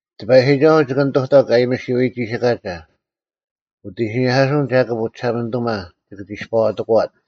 ᑎᐸᔨᒋᒐᓱᐤ ᒋᑭ ᓂᑐᑕᒄ ᐊᔨᒥᓱᐎ ᒋᓯᑲᒐ: ᐅᑦ ᐃᓯᓂᐧᑲᓱᐅᓐ ᒐᑭᑉ ᐅᒋᓴᒪᓂᑐᒪ ᒋᑭ ᒋᔅᐸᐛᑎᑯᐛᓐ;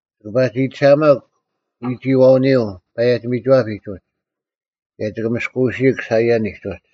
ᒋᑭ ᐸᒋᑎᓴᐊᒪᒄ ᐎᒋᐃᐛᐅᓂᔪᐤ ᐸᔭᒋ-ᒥᒋᐛᐱᒡ ᐅᒡ, ᑭᔭ ᒋᑭ ᒥᔅᑯᐅᓯᐃᒄ ᓴᐃᔭᓂᒡ ᐅᒡ;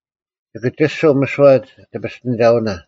ᒋᑭ ᒋᔅᒋᓯᐤ ᒥᓯᐛ ᒋᐱᔅᑎᓂᒐᐅᓇ,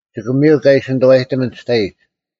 ᒋᑭ ᒥᔨᒄ ᐊ ᐃᓯ ᓂᑐᐛᔨᑎᒥᓐ ᒋᑕᐃᒡ,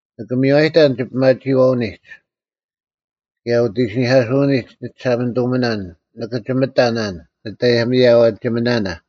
ᓂᑭ ᒥᔽᔨᑕᓇᓐ ᒋᐱᒪᒋᐃᐛᐅᓂᒡ, ᑭᔭ ᐅᑦ ᐃᓯᓂᐧᑲᓱᐅᓂᒡ ᓂᒋᓴᒪᓂᑐᒥᓇᓐ ᓂᑭ ᒋᒥᑕᓇᓐ ᓂᑦ ᐊᔭᒥᐊᐛᒋᓂᒥᓇᓇ,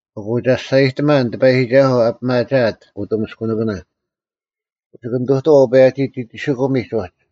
ᐊᑯ ᒐᔅᒐᔨᑎᒪᓐ ᑎᐸᔨᒋᒐᓱᐤ ᐊ ᐱᒪᒋᐊᑦ ᐅᑐᒥᔅᑯᓇᑭᓇ᙮ ᒋᑭ ᓂᑐᑐᐛᐤ ᐅᐸᔭᒋ-ᒋᒋᒋᓯᑯᒥᒡ ᐅᒡ,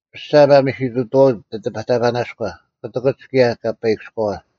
ᐱᔅᒐ ᒪᒥᓯᑐᑕᐛᐅᒡ ᑎᑎᐱᑕᐸᓇᔎ, ᑯᑎᑭᒡ ᑭᔭ ᑲᐸᐃᑭᔎᐛ: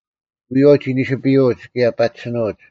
ᐎᔨᐛᐤ ᒋ ᓂᓯᐱᔪᐅᒡ ᑭᔭ ᐸᒋᓯᓄᐅᒡ: